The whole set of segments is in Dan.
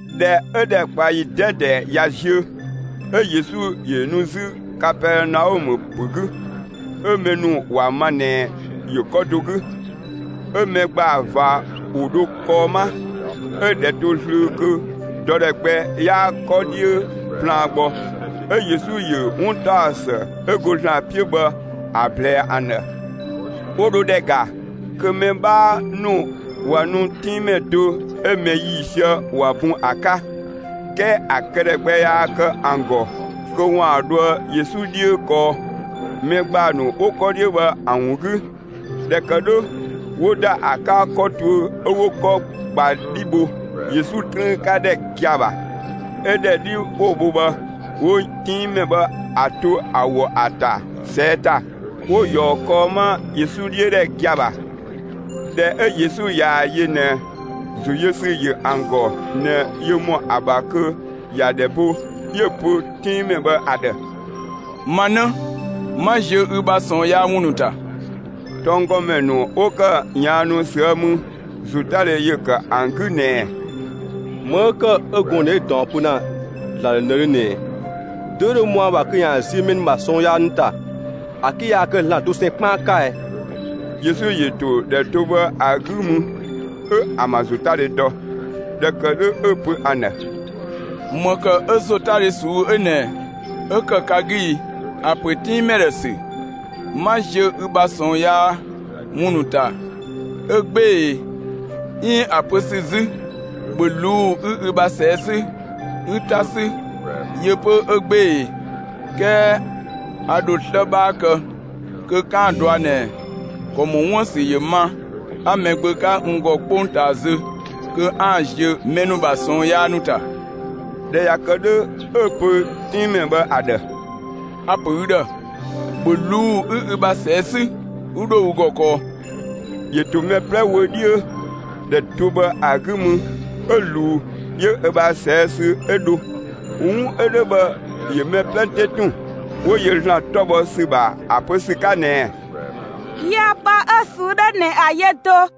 ꞊Dhɛ 'ö ‑dhɛkpaɔyi 'dɛdɛ ꞊ya ziö 'ö Yesu ‑yö nu 'zü Kapɛɛnaɔmë ‑pö 'gü. 'Ö mɛ ‑nu ‑wa ma ꞊nɛ ‑yö 'kɔ do 'gü. 'Ö mɛ ‑gbaa ꞊va ‑wo dho kɔɔ 'ma, 'ö‑ ‑dhɛ to zlöö kö dɔ ‑dhɛ gbɛ 'yaa 'kɔ 'dhiö plaan gbɔ. 'Ö Yesu ‑yö 'wuntaɔsë 'ö go ‑Zlan 'piö bhë ‑a ꞊blɛɛ ‑an ‑dhë. 'Wo dho ‑dhɛ ‑ga kö mɛ 'bhaa ‑nu ꞊wa nu 'tinngmɛ do 'ö mɛ ‑yiisië ‑wa bun ‑a 'ka. 'Kɛɛ ‑a këdhɛ gbɛ yaa kë ‑an ‑gɔ kö ‑waan dhoë Yesu 'dhiö kɔɔ, mɛ ‑gbaa ‑nu 'wo 'kɔ 'dhiö bhë ‑an ‑wun 'gü. ꞊Dhɛ ‑kë 'dhö ‑wo ‑da ‑a 'ka 'kɔ tuö 'ö 'wo 'kɔ ꞊gba 'dhi bho Yesu 'trüün 'ka ‑dhɛ gia‑ ‑bha. 'Ö ‑dhɛ 'dhi 'wo‑ bho bhë, 'wo 'tinngmɛ bhë ‑a to ö ‑wɔ ‑a ‑ta ꞊sɛɛ' ‑ta, 'wo‑ ꞊yɔɔ kɔɔ 'ma Yesu 'dhiö ‑dhɛ gia‑ ‑bha. ꞊Dhɛ 'ö Yesu ꞊yaa‑ yö ꞊nɛ ‑zo yö ‑sü ‑yö ‑an ‑gɔ ꞊nɛ yö ‑mɔ ‑a ‑bha kö ‑ya ‑dhɛ bo, 'yö‑ pö 'tinngmɛ bhë ‑a ‑dhë: «Ma 'në, 'ma ziö ü bha ꞊sɔɔn yaa ‑wun ‑nu ‑ta.» Tɔnggɔmɛ ‑nu 'wo ‑kë ꞊yaannu ꞊süë' mü, ‑zotadhe ‑yö ‑kë ‑an 'gü ꞊nɛɛ: «‑Më 'ö ‑kë 'ö gɔɔn‑ 'ö ꞊nɛ 'ö ꞊daɔn pö ‑Zlan ‑dhë ꞊nëdhö ꞊nɛɛ? Dö 'ö dho ‑mɔ ‑a ‑bha kö ‑yaan ziö mɛ ‑nu ‑bha ꞊sɔɔn yaa ‑nu ‑ta, ‑a 'ke yaa kë ‑Zlan dosɛn 'kpaan 'ka ɛ?» Yesu ‑yö ‑to ‑dhɛ do bhë ‑a 'gü mü 'ö ‑an ‑bha ‑zotadhe dɔ; ꞊dhɛ ‑kë 'dhö, 'ö‑ pö ‑an ‑dhë: «‑Më ‑kë 'ö ‑zotadhe ꞊suu'‑ 'ö ꞊nɛ 'ö ‑kë ka 'gü ‑i? ‑A ‑pö 'tinngmɛ ‑dhɛ ‑sü: ‹'Ma ziö ü ‑bha ꞊sɔɔn yaa ‑wun ‑nu ‑ta› 'ö 'gbee‑ ‑e, 'iin ‑a pö ‑sü 'zü: ‹‑Bhö ꞊luu'‑ 'ü ü ‑bha ꞊sɛɛ' 'sü 'ü 'ta 'sü› yö 'pö 'ö 'gbee‑ ‑e? 'Kɛɛ a ‑dho 'slë 'bhaa kë kö 'kaan‑ ‑a dɔa ꞊nɛ ‑kɔ ‑mɔ 'wuën‑ ‑sü ‑yö ma 'a Mɛgbö 'ka n ‑gɔ 'kpongtaa zö kö 'aan‑ ziö mɛ ‑nu ‑bha ꞊sɔɔn yaa ‑nu ‑ta.» ꞊Dhɛ ꞊ya kë 'dhö, 'ö‑ pö 'tinngmɛ bhë ‑a ‑dhë: «A‑ ‑pö ü ‑dhë: ‑Bhö ꞊luu'‑ 'ü ü bha ꞊sɛɛ' 'sü 'ü 'dho ü ‑gɔ kɔɔ!» ‑Yö ‑to mɛ 'plɛ wö 'dhiö, ‑dhɛ do bhë ‑a 'gü mü 'ö ꞊luu 'yö ö bha ꞊sɛɛ' sü 'ö dho. 'Wun 'ö 'dhö bhë ‑yö mɛ 'plɛ 'te ‑tun, 'wo yö ‑Zlan 'tɔ bhɔ ‑sü ‑bha ‑a pö ‑sü 'ka ꞊nɛɛ: «Yiëë pë 'ö‑ ꞊suu'‑ 'dhö ꞊nɛ ‑a yö do!»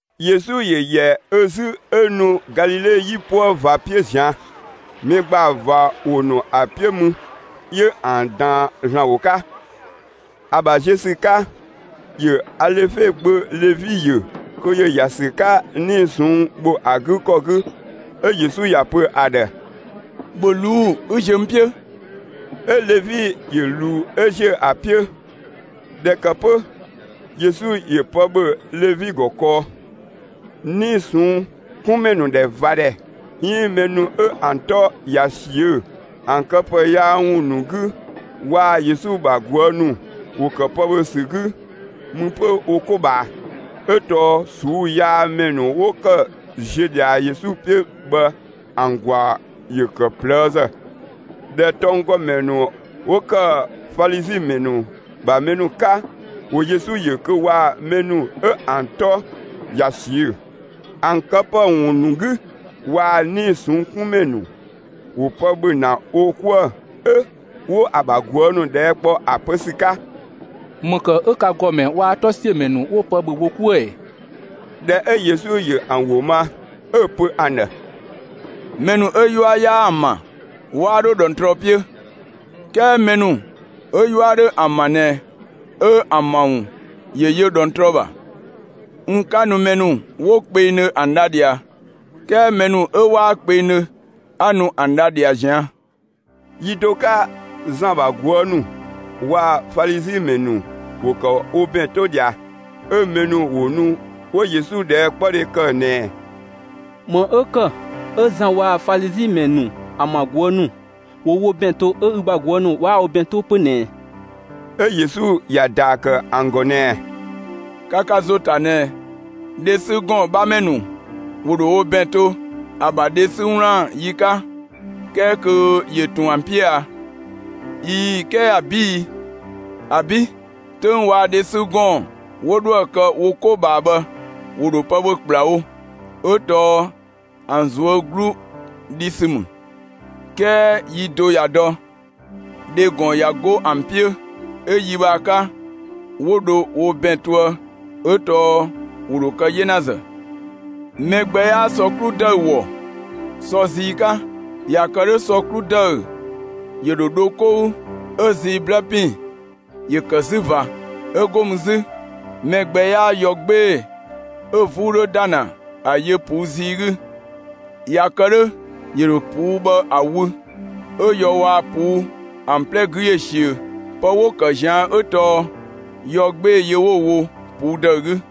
Yesu ‑yö ‑yɛ ö 'zü 'ö nu Galile 'yipuë ꞊va 'piö ꞊zian'. Mɛ ‑gbaa ꞊va ‑wo ‑nu ‑a 'piö mü 'yö ‑an ꞊daan ‑Zlan ‑wo 'ka. ‑A ‑bha ziö ‑sü 'ka, ‑yö Alefe gbö Levi ‑yö kö ‑yö ‑ya ‑sü 'ka 'nii‑ ꞊sɔnng' ‑bho ‑a 'gü ‑kɔ 'gü ‑a yö. 'Ö Yesu ‑ya pö ‑a ‑dhë: «‑Bhö ꞊luu'‑ 'ü ziö n 'piö!» 'ö Levi ‑yö ꞊luu 'ö ‑ziö ‑a 'piö. ꞊Dhɛ ‑kë 'pö Yesu ‑yö pë ‑bhö Levi ‑gɔ kɔɔ. 'Nii‑ ꞊sɔnng' 'kun ‑mɛ ‑nu ‑dhɛ ꞊va ‑dhɛ 'iin mɛ ‑nu 'ö ‑an 'tɔ ꞊ya ꞊siö'‑ ‑an këpë yaa ‑wun ‑nu 'gü waa‑ Yesu ‑bha ꞊guë' ‑nu ‑wo ‑kë pë ‑bhö ‑sü 'gü mü 'pö wo 'ko ꞊bhaa, 'ö tɔɔ ꞊suu'‑ yaa ‑mɛ ‑nu 'wo ‑kë ‑ziö ꞊dhia Yesu 'piö bhë ‑an ‑gwaa ‑yö ‑kë ꞊plëëzë. ꞊Dhɛ tɔnggɔmɛ ‑nu 'wo ‑kë Falizi ‑mɛ ‑nu ‑bha mɛ ‑nu 'ka, ‑wo Yesu ‑yö kö waa‑ mɛ ‑nu 'ö ‑an 'tɔ ꞊ya ꞊siö'‑ ‑an këpë ‑wun ‑nu 'gü, waa‑ 'nii‑ ꞊sɔnng' 'kun ‑mɛ ‑nu, ‑wo pë ‑bhö ‑na wo 'kuë‑, 'ö 'wo‑ ‑bha ꞊guë' ‑nu ꞊dhɛɛ' kpɔ ‑a pö ‑sü 'ka: «‑Më ‑kë 'ö ka ‑gɔmɛ waa‑ 'tɔsiömɛ ‑nu 'wo pë ‑bhö wo 'kuë‑ ‑ɛ?» ꞊Dhɛ 'ö Yesu ‑yö ‑an ‑wo ma, 'ö‑ pö ‑an ‑dhë: «Mɛ ‑nu 'ö 'yua 'yaa ‑an ‑bha 'waa 'dho ꞊dhɔngtrɔ 'piö. 'Kɛɛ mɛ ‑nu 'ö 'yua 'dhö ‑an ‑bha ꞊nɛ 'ö ‑an ‑bha ‑wun ‑yö yö ꞊dhɔngtrɔ ‑bha. N 'ka nu mɛ ‑nu 'wo kpengdhö ‑an dha ꞊dhia, 'kɛɛ mɛ ‑nu 'ö 'waa kpengdhö 'a nu ‑an dha ꞊dhia ꞊zian'.» Yi do 'ka Zan ‑bha ꞊guë' ‑nu waa‑ Falizi ‑mɛ ‑nu ‑wo ‑kë wo ‑bɛn 'to ꞊dhia, 'ö mɛ ‑nu ‑wo nu 'wo Yesu ꞊dhɛɛkpɔdhe ‑kë ꞊nɛɛ: «‑Më 'ö ‑kë 'ö Zan waa‑ Falizi ‑mɛ ‑nu ‑an ‑bha ꞊guë' ‑nu ‑wo wo ‑bɛn to 'ö ü ‑bha ꞊guë' ‑nu 'waa wo ‑bɛn 'to 'pö ꞊nɛ ꞊ɛ?» 'Ö Yesu ‑ya ‑daa ‑kë ‑an ‑gɔ ꞊nɛɛ: «Ka ka ‑zo ‑ta ꞊nɛ, dhe 'sü ‑gɔɔn 'bhamɛ ‑nu ‑wo ‑dho wo ‑bɛn to, ‑a ‑bha dhe 'sü 'wlaan‑ yi 'ka, 'kɛɛ kö ‑yö ꞊tun ‑an 'piö a? ꞊Ii‑, 'kɛɛ ‑abi' i? ‑Abi'. 'Töng waa‑ dhe 'sü ‑gɔɔn 'wo dhoë‑ kë wo 'ko ꞊bhaa bhë, ‑wo ‑dho pë ‑bhö ‑kplawo, ('ö tɔɔ ‑an ꞊zuö' 'glu dhi ‑sü ‑mü). 'Kɛɛ yi do ꞊ya dɔ, dhe ‑gɔn ꞊ya 'go ‑an 'piö, 'ö‑ yi bhë ‑a 'ka 'wo dho wo ‑bɛn toë ('ö tɔɔ ‑wo ‑dho kë 'yenazë). Mɛ gbɛ 'yaa sɔ 'klu ‑dëü ‑wɔ sɔ zii 'ka. ꞊Ya kë 'dhö sɔ 'klu ‑dëü ‑yö ‑dho dho 'kou 'ö‑ zii 'blë ‑pin ‑yö ‑kë 'zü ꞊va. 'Ö 'go mü 'zü mɛ gbɛ 'yaa yɔ 'gbee‑ 'ö 'vuu 'dhö ‑da ‑na ‑a yö ꞊puu' zii 'gü. ꞊Ya kë 'dhö ‑yö ‑dho ꞊puu' bhë ‑a wü, 'ö yɔ waa‑ ꞊puu' ‑an 'plɛ 'gü ‑yö ꞊siö. Pë 'wo‑ ‑kë ꞊zian' 'ö tɔɔ yɔ 'gbee‑ yö 'wo‑ wo ꞊puu' ‑dëü 'gü.»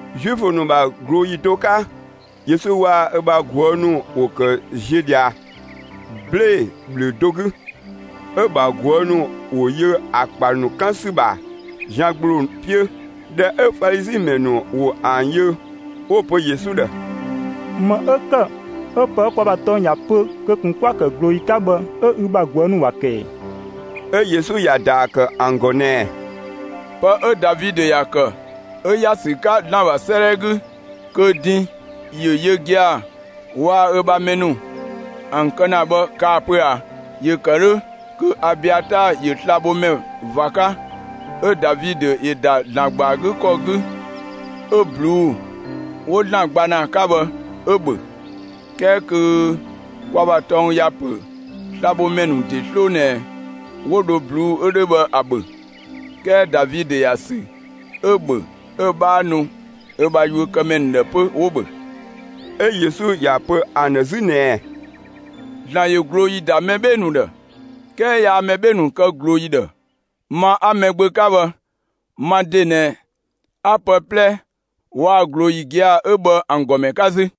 Zuifö ‑nu ‑bha ꞊glooyi do 'ka, Yesu waa‑ ö ‑bha ꞊guë' ‑nu ‑wo ‑kë ziö ꞊dhia 'blee‑ ‑bhlö do 'gü. 'Ö‑ ‑bha ꞊guë' ‑nu ‑wo yö ‑a ‑kpa ‑nu 'kan ‑sü ‑bha zian ‑gbloo 'piö. ꞊Dhɛ 'ö Falizi ‑mɛ ‑nu ‑wo ‑an yö, 'wo‑ pö Yesu ‑dhë: «‑Më 'ö ‑kë 'ö pë 'ö kwa ‑bha tɔng ‑ya pö kö ꞊kun 'kwa‑ ‑kë ꞊glooyi 'ka bhë 'ö ü ‑bha ꞊guë' ‑nu ‑wa ‑kë ‑ɛ?» 'Ö Yesu ‑ya ‑daa ‑kë ‑an ‑gɔ ꞊nɛɛ: «Pë 'ö Davidö ‑ya ‑kë 'ö ‑ya ‑sü 'ka ‑Zlan ‑bha 'sëëdhɛ 'gü kö din ‑yö yö gia‑ waa‑ ö ‑bha mɛ ‑nu ‑an kë ‑na bhë kaa‑ pö ꞊a? ‑Yö ‑kë 'dhö kö Abiataa ‑yö slabhomɛ ꞊va 'ka; 'ö Davidö ‑yö ‑da ‑Zlan ‑gba ‑a 'gü ‑kɔ 'gü 'ö ꞊bluu'‑ 'wo ‑Zlan gba ‑na ‑a 'ka bhë 'ö‑ ‑bhö. 'Kɛɛ kö kwa ‑bha tɔng ‑ya pö slabhomɛ ‑nu ‑de 'sloo ꞊nɛ 'wo dho ꞊bluu'‑ 'ö 'dhö ‑a ‑bhö, 'kɛɛ Davidö ‑ya ‑sü 'ö‑ ‑bhö 'ö‑ 'bhaa nu ö ‑bha yuökëmɛ ‑nu ‑dhë 'pö, 'wo‑ ‑bhö.» 'Ö Yesu ‑ya pö ‑an ‑dhë 'zü ꞊nɛɛ: «‑Zlan ‑yö ꞊glooyi ‑da mɛ 'bhee‑ ‑nu ‑dhë 'kɛɛ yaa mɛ 'bhee‑ ‑nu kë ꞊glooyi ‑dhë. Ma 'a Mɛgbö 'ka bhë ma ‑de ꞊nɛ 'a pë 'plɛ waa‑ ꞊glooyi gia‑ 'ö bhë ‑an ‑gɔmɛ 'ka 'zü.»